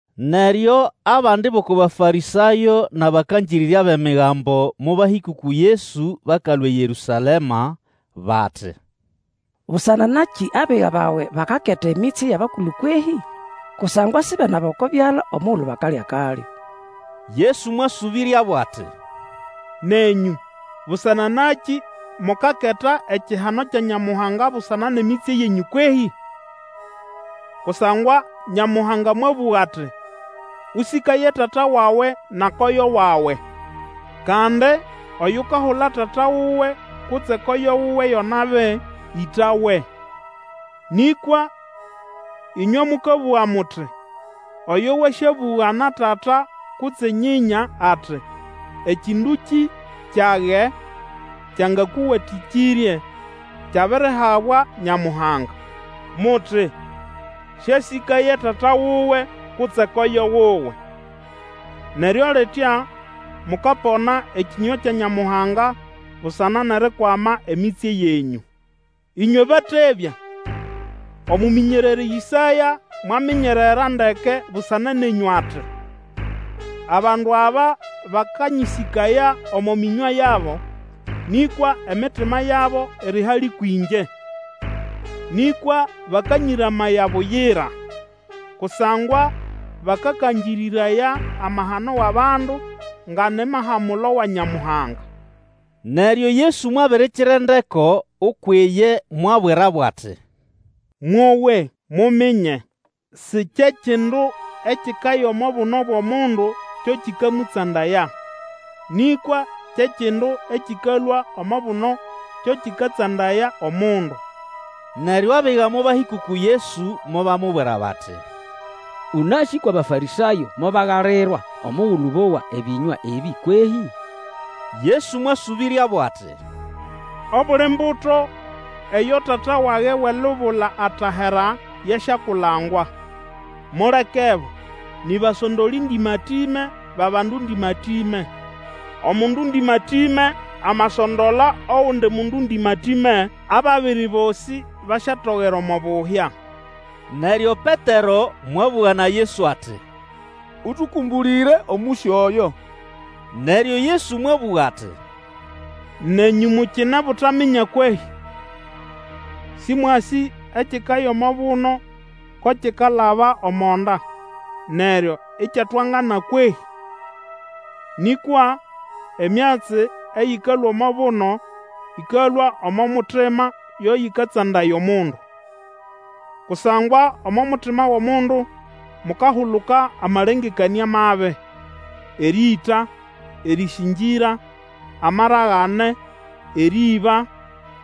Neryo abandi bʼoko Bafarĩsayo nʼabakangĩrĩrya bʼEmigambo mobahĩka uku Yesu bakalũa eYerũsalema, bati, Busana nakĩ abiga bawe bakaketa emitsye yʼabakulu kwehĩ? Kusangwa sibenaba oko byala omugulu bakalya akalyo. Yesu mwasũbĩryabo ati, Nenyũ, busana nakĩ mukaketa ekihano kya Nyamuhanga busana nʼemitsye yenyũ kwehĩ? Kusangwa Nyamuhanga mwabũga ati, Ũsĩkaye tata wawe na koyo wawe, kandi, Oyukahula tata wuwe kutse koyo wuwe yo nabi, ĩtawe. Nĩkwa ĩnywe mũkabũga muti, Oyo wasyabũga na tata kutse nyĩnya ati, Ekĩndũkĩ kyage kyangakũwatĩkĩrye kyabirihabwa Nyamuhanga. Muti, siasĩkaye tata wuwe kutse koyo wuwe. Neryo litya, mukapona ekĩnywa kya Nyamuhanga busana nʼerikwama emitsye yenyũ. Ĩnywe batebya! Omũmĩnyererĩ Ĩsaya mwaminyerera ndeke busana nenyũ, ati, Abandu aba bakanyĩsĩkaya omo mĩnywa yabo, Nĩkwa emitima yabo iri hali kwĩngye. Nĩkwa bakanyĩramaya buyira. Kusangwa bakakangĩrĩraya amahano wʼabandu nga ni mahamulo wa Nyamuhanga. Neryo Yesu mwabirikira endeko ukwʼiye mwabwirabo ati, Mwowe, muminye. Si kye kindu ekikaya omo buno bwʼomundu kyo kikamũtsandaya, nĩkwa kye kindu ekĩkalũa omo buno, kyo kĩkatsandaya omundu. Neryo abiga mobahĩka uku Yesu mobamubwira bati, Ũnasĩ kwʼAbafarĩsayo mobagalirwa omugulu bowa ebĩnywa ebĩ kwehĩ? Yesu mwasũbĩryabo ati, Obuli mbuto eyo Tata wage wʼelubula atahera yasyakulangwa. Mulekebo, ni basondolĩ ndĩmatĩme bʼabandu ndĩmatĩme. Omundu ndĩmatĩme amasondola ogundi mundu ndĩmatĩme, ababiri bosĩbasyatogera omo buhya. Neryo Petero mwabũga na Yesu ati, Ũtũkũmbũlĩre omũsyo oyo. Neryo Yesu mwabũga ati, Nenyũ mukine butaminya kwehĩ? Sĩmwasĩ ekikaya omo buno ko kikalaba omo nda, neryo ikyatwangana kwehĩ? Nĩkwa emyatsi eyĩkalũa omo buno ĩkalũa omo mutima yo yĩkatsandaya omundu. Kusangwa omo mutima wʼomundu mukahuluka amalengekanĩa mabi, erĩĩta, erĩsĩngĩra, amaragane, erĩĩba,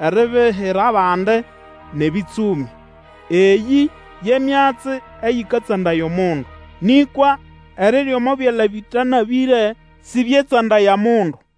eribihira bandi, nʼebĩtsũmĩ. Eyĩ ye myatsi eyĩkatsandaya omundu. Nĩkwa erirya omo byala bĩtanabĩre sĩbyetsandaya mundu.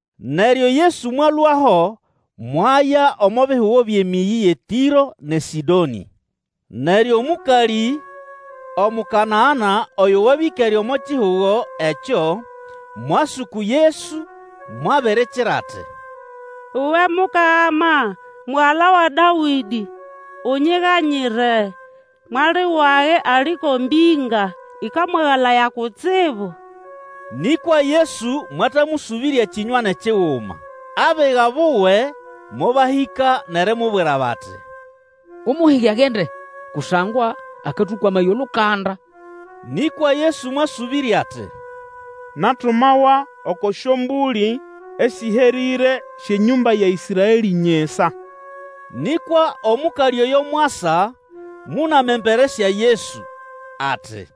Neryo Yesu mwalũaho mwaya omo bihugo byʼemĩyĩ yʼeTĩro nʼeSĩdonĩ. Neryo mũkalĩ, Omukanana oyo wabya ĩkere omo kihugo ekyo, mwasa uku Yesu, mwabirikira ati, Uwe Mukama, mugala wa Dawĩdĩ, unyiganyire. Mwali wage ali ko mbĩnga ĩkamwagalaya kutsibu. Nĩ kwa Yesu mwatamũsũbĩrya kĩnywa nʼekiguma. Abiga buwe mobahĩka nʼerimubwira bati, Umuhige agende, kusangwa akatũkwamaya olukanda. Nĩkwa Yesu mwasũbĩrya ati, Natumawa oko syombũlĩ esĩherĩre syʼenyũmba ya Ĩsraelĩ nyisa. Nĩkwa omũkalĩ oyo mwasa, mũnama embere sya Yesu, ati,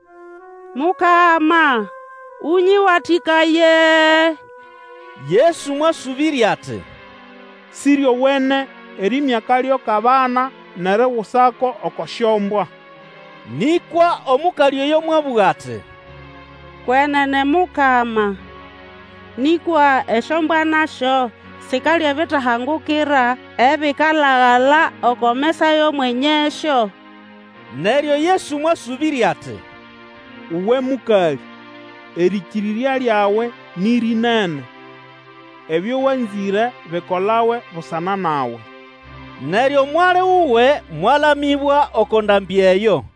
Mukama, ũnyĩwatĩkaye! Yesu mwasũbĩrya ati, Sĩryowene erĩĩmya akalyo kʼabana nʼerigusako oko syombwa. Nĩkwa omũkalĩ oyo mwabũga ati, Kwenene, Mukama, nĩkwa esyombwa nasyo sikalya ebitahangukira ebikalagala oko mesa ya mwenyesyo. Neryo Yesu mwasũbĩrya ati, Uwe mũkalĩ, erĩkĩrĩrya lyawe nĩ rĩnene! Ebyo wanzĩre bikolawe busana nawe. Neryo mwali wuwe mwalamĩbwa oko ndambĩ eyo.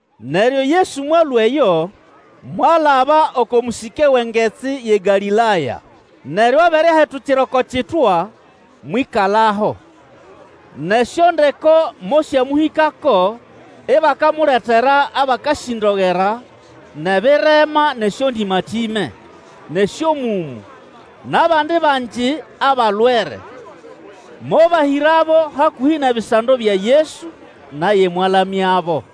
Neryo Yesu mwalũa eyo, mwalaba oko mũsĩke wʼengetsi yʼeGalĩlaya. Neryo abere ahetukira oko kitwa, mwĩkalaho. Nʼesyondeko mosyamũhĩkako, ibakamuletera abakasĩndogera, nʼebirema nʼesyondĩmatĩme, nʼesyomũmũ, nʼabandi bangi abalwere, mobahĩrabo hakũhĩ nʼebisando bya Yesu, naye mwalamyabo.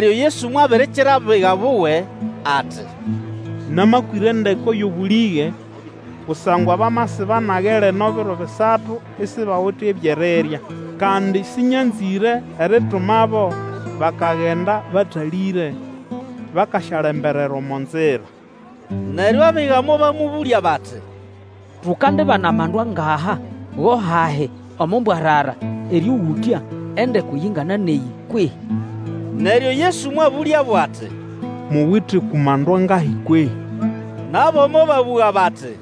Neryo Yesu mwabirikira abiga buwe, ati, Namakwĩra endeko yʼobũlĩge, kusangwa bamasiba nage lino biro bisatu, isibawite ebyʼerirya. Kandi sĩnyanzĩre eritumabo bakagenda batalĩre, bakasyalemberera omo nzira. Neryo abiga mobamũbũlya bati, Tukandibana amandu angaha go hahi omo mbwarara erĩũgũtya endeko yingana nʼeyĩ kwehĩ? Neryo Yesu mwabũlyabo ati, Muwite uku mandu angahi kwehĩ? Nabo mobabũga bati,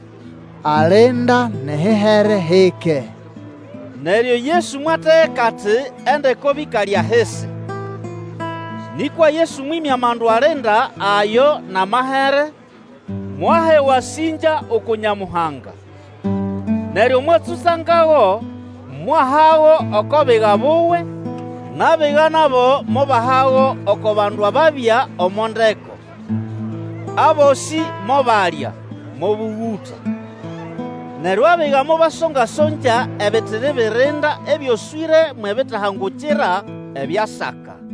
Alinda, nʼehihere hike. Neryo Yesu mwategeka ati endeko bĩkale ahisi. Nĩkwa Yesu mwĩmya amandu alinda ayo nʼamahere, mwaha ewasĩngya uku Nyamuhanga, neryo mwatsũtsangago mwahago oko biga buwe, nʼabiga nabo mobahago oko bandu ababya omo ndeko. Abosĩ mobalya, mobũgũta. Neryo abiga mobasongya-songya ebitiri birinda ebyoswĩre mwʼebitahangukira ebyasaka.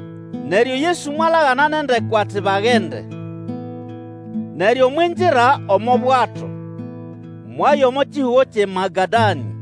Neryo Yesu mwalagana nʼendeko ati bagende. Neryo mwingira omo bwato, mwaya omo kihugo kyʼeMagadanĩ.